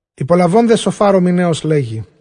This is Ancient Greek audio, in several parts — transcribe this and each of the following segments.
Ὑπολαβὼν δὲ Σωφὰρ ὁ Μιναῖος, λέγει,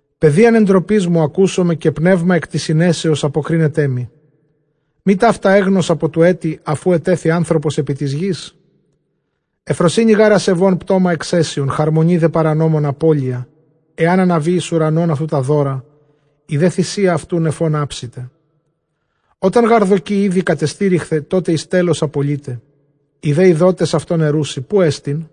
Παιδείαν ἐντροπῆς μου ἀκούσομαι, καὶ πνεῦμα ἐκ τῆς συνέσεως ἀποκρίνεταί μοι. Μὴ ταῦτα ἔγνως ἀπὸ τοῦ ἔτι, ἀφʼ οὗ ἐτέθη ἄνθρωπος ἐπὶ τῆς γῆς; Εὐφροσύνη δὲ ἀσεβῶν πτῶμα ἐξαίσιον, χαρμονὴ δὲ παρανόμων ἀπώλεια· ἐὰν ἀναβῇ εἰς οὐρανὸν αὐτοῦ τὰ δῶρα, ἡ δὲ θυσία αὐτοῦ νεφῶν ἅψηται. Ὅταν γὰρ δοκῇ ἤδη κατεστηρίχθαι, τότε εἰς τέλος ἀπολεῖται· οἱ δὲ εἰδότες αὐτὸν ἐροῦσι, ποῦ ἐστιν;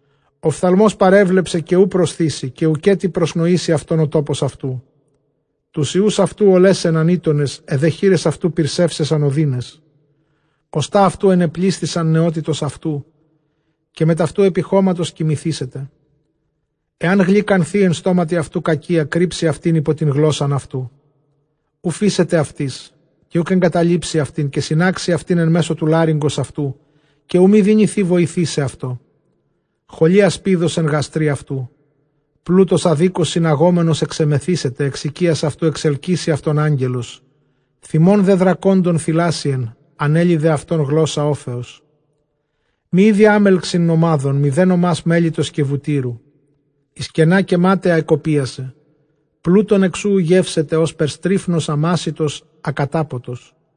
Ὀφθαλμὸς παρέβλεψε, καὶ οὐ προσθήσει, καὶ οὐκ ἔτι προσνοήσει αὐτὸν ὁ τόπος αὐτοῦ. Τοὺς υἱοὺς αὐτοῦ ὀλέσαισαν ἥττονες, αἱ δὲ χεῖρες αὐτοῦ πυρσεύσαισαν ὀδύνας. Ὀστᾶ αὐτοῦ ἐνεπλήσθησαν νεότητος αὐτοῦ, καὶ μετʼ αὐτοῦ ἐπὶ χώματος κοιμηθήσεται. Ἐὰν γλυκανθῇ ἐν στόματι αὐτοῦ κακία, κρύψει αὐτὴν ὑπὸ τὴν γλῶσσαν αὐτοῦ, οὐ φείσεται αὐτῆς, καὶ οὐκ ἐγκαταλείψει αὐτήν· καὶ συνάξει αὐτὴν ἐν μέσῳ τοῦ λάρυγγος αὐτοῦ, καὶ οὐ μὴ δυνηθῇ βοηθῆσαι ἑαυτῷ· χολὴ ἀσπίδος ἐν γαστρὶ αὐτοῦ. Πλοῦτος ἀδίκως συναγόμενος ἐξεμεθήσεται, ἐξ οἰκίας αὐτοῦ ἐξελκύσει αὐτὸν ἄγγελος. Θυμὸν δὲ δρακόντων θηλάσειεν, ἀνέλοι δὲ αὐτὸν γλῶσσα ὄφεως. Μὴ ἴδοι ἄμελξιν νομάδων, μηδὲ νομὰς μέλιτος καὶ βουτύρου. Εἰς κενὰ καὶ μάταια ἐκοπίασε, πλοῦτον ἐξ οὗ οὐ γεύσεται· ὥσπερ στρίφνος ἀμάσητος, ἀκατάποτος.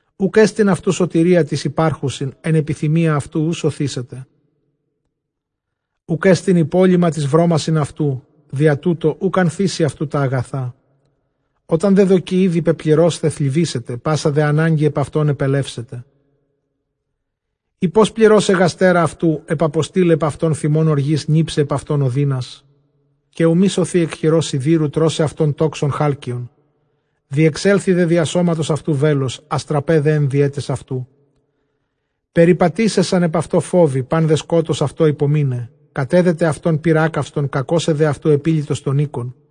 Οὐκ ἔστιν αὐτοῦ σωτηρία τοῖς ὑπάρχουσιν, ἐν ἐπιθυμίᾳ αὐτοῦ οὐ σωθήσεται. Οὐκ ἔστιν ὑπόλειμμα τοῖς βρώμασιν αὐτοῦ, διὰ τοῦτο οὐκ ἀνθήσει αὐτοῦ τὰ ἀγαθά. Ὅταν δὲ δοκῇ ἤδη πεπληρῶσθαι, θλιβήσεται, πᾶσα δὲ ἀνάγκη ἐπʼ αὐτὸν ἐπελεύσεται. Εἴ πῶς εἶ πληρῶσαι γαστέρα αὐτοῦ, ἐπαποστείλαι ἐπʼ αὐτὸν θυμὸν ὀργῆς, νίψαι ἐπʼ αὐτὸν ὀδύνας, καὶ οὐ μὴ σωθῇ ἐκ χειρὸς σιδήρου· τρώσαι αὐτὸν τόξον χάλκειον. Διεξέλθοι δὲ διὰ σώματος αὐτοῦ βέλος, ἄστρα δὲ ἐν διαίταις αὐτοῦ· περιπατήσαισαν ἐπʼ αὐτῷ φόβοι, πᾶν δὲ σκότος αὐτῷ ὑπομείναι· κατέδεται αὐτὸν πῦρ ἄκαυστον, κακώσαι δὲ αὐτοῦ ἐπήλυτος τὸν οἶκον.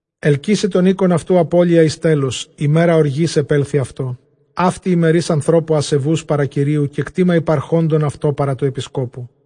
Ἑλκύσαι τὸν οἶκον αὐτοῦ ἀπώλεια εἰς τέλος, ἡμέρα ὀργῆς ἐπέλθοι αὐτῷ. Αὕτη ἡ μέρις ἀνθρώπου ἀσεβοῦς παρὰ Κυρίου, καὶ κτῆμα ὑπαρχόντων αὐτῷ παρὰ τοῦ ἐπισκόπου.